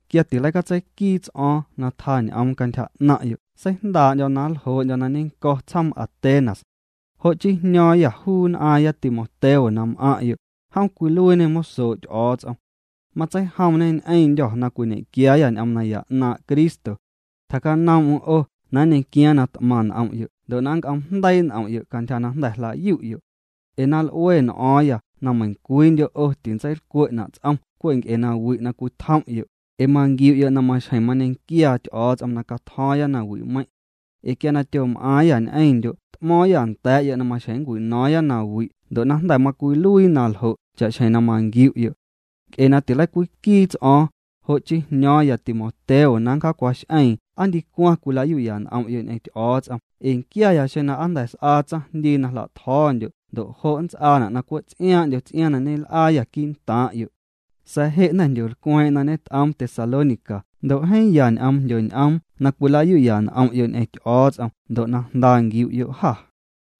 Quia tileicatseiquiiti ts'o̱o̱ⁿ na tjaa ñ'oom cantyja 'naⁿ'yo' seijndaa'ndyo̱ na nljoo'ndyo̱ na ñeⁿnnco̱ tsjoom Atenas. Jo' chii jño̱o̱ⁿyâ juu nn'aaⁿya Timoteo na m'aⁿ'yo', jom cwiluiiñê mosoo' Ty'o̱o̱ts'om. Matseijomñê ñ'eⁿndyô̱ na cwiñe'quiaayâ ñ'oom naya 'naaⁿ' Cristo. Tjacanoom'm 'o na nñequiaaⁿ na t'maⁿ n'om'yo' ndo' na nnc'oom'jndeii' n'om'yo' cantyja na jnda̱ jla'yu'yo'. Ee na l'ue n'o̱o̱ⁿyâ na meiⁿcwiindyo' 'o tintseilcwe'na' ts'om cwe' nc'e na wi' na cwitjom'yo'. Ee manquiu'yo' na maxjeⁿ mañequiaa Ty'o̱o̱ts'om na catjo̱o̱ⁿya nawi'meiⁿ'. Ee quia tyom'aaⁿyâ ñ'eⁿndyo' t'mo̱o̱ⁿyâ nda̱a̱'yo' na maxjeⁿ nncwino̱o̱ⁿya nawi' ndo' jnda̱ macwiluii naljo' cha'xjeⁿ na manquiu'yo'. Nc'e na tileicwiquiiti ts'o̱o̱ⁿ, jo' chii jño̱o̱ⁿya Timoteo na ncjacwax'eeⁿ aa ndicwaⁿ cwila'yu'ya n'om'yo' ñ'eⁿ Ty'o̱o̱ts'om ee nquiaya xeⁿ na aa jnda̱ s'aa tsaⁿjndii na jla'tjo̱o̱ndyo' ndo' jo' nnts'aana' na cwe' ts'iaaⁿ'ndyo ts'iaaⁿ na ñel'aayâ quii'ntaaⁿ'yo'. Sa̱a̱ je' jnda̱ jndyolcweeⁿ'eⁿ na ñet'oom Tesalónica ndo' jeeⁿ ya ñ'oom jndyoñ'oom na cwilayu'ya n'om'yo' ñ'eⁿ Ty'o̱o̱ts'om ndo' na jnda nquiu'yo' jâ.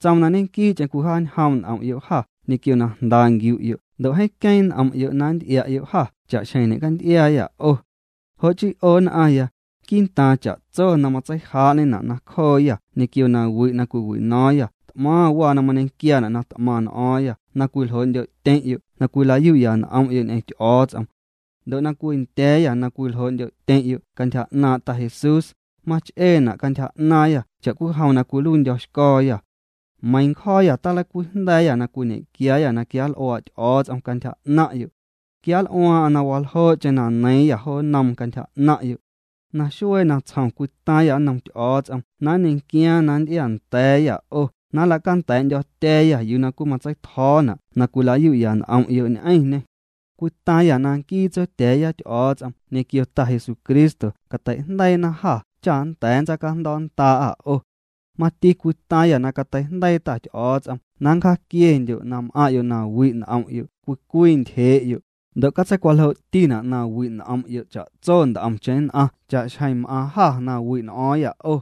Tsoom na ñequii'cheⁿ cwijaañjoom' n'om'yo' jâ ñequio na jnda nquiu'yo' ndo' jeeⁿ queeⁿ n'om'yo' na nnty'ia'yo' jâ cha'xjeⁿ ñe'canty'iaayâ 'o. Jo' chii 'o nn'aⁿya, quii'ntaaⁿ cha'tso na matseijaa'ñena' nacjooyâ ñequio nawi' na cwiwino̱o̱ⁿyâ t'maⁿ waa na mañequiaana' na t'maⁿ n'o̱o̱ⁿyâ na cwiljoo'ndyo'tyeⁿ'yo' na cwila'yu'ya n'om'yo' ñ'eⁿ Ty'o̱o̱ts'om. Ndo' na cwindya̱a̱yâ na cwiljoo'ndyo'tyeⁿ'yo' cantyja 'naaⁿ' Ta Jesús, mach'eena' cantyja 'naaⁿyâ cha'cwijom na cwiluiindyo̱xco̱o̱yâ. Meiiⁿ ncjo̱o̱yâ tileicwijnda̱a̱yâ na cwiñe'quiaayâ na quianl'uaa' Ty'o̱o̱ts'om cantyja 'naⁿ'yo'. Quianl'uaaⁿ'aⁿ na waljoo'cheⁿ na neiiⁿyâ jo nnoom cantyja 'naⁿ'yo'. Naxuee natsjom cwitaaⁿyâ nnom Ty'o̱o̱ts'om na nñequiaaⁿ na nnty'iaanda̱a̱yâ 'o na nla'canda̱a̱'ndyo̱tya̱a̱yâ yuu na cwimatseitjo̱o̱na' na cwila'yu'ya n'om'yo' ñ'eⁿñê. Cwitaaⁿyâ na nquii Tsotya̱a̱ya Ty'o̱o̱ts'om ñequio Ta Jesucristo cateijndeiina jâ cha nnda̱a̱ nntsaacajndo̱o̱'nndaa'â 'o. Mati cwitaaⁿyâ na cateijndeii Ta Ty'o̱o̱ts'om na nncjaaquiendyo' na m'aⁿ'yo' na wi' n'om'yo' cwii cwii ntyjee'yo'. Ndo' catseicwaljoo'tina' na wi' n'om'yo' cha'tso nt'omcheⁿ nn'aⁿ cha'xjeⁿ m'aaⁿ jâ na wi' n'o̱o̱ⁿyâ 'o.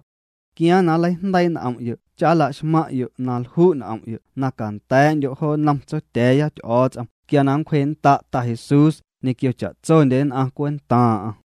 Quiaaⁿ na nleijndeii' n'om'yo' cha nla'xmaⁿ'yo' na lju' n'om'yo' na canda̱a̱'ndyo' jo nnom Tsotya̱a̱ya Ty'o̱o̱ts'om quia na nncwjee'nnda' Ta Jesús ñequio cha'tsondye nn'aⁿ cwentaaⁿ'aⁿ.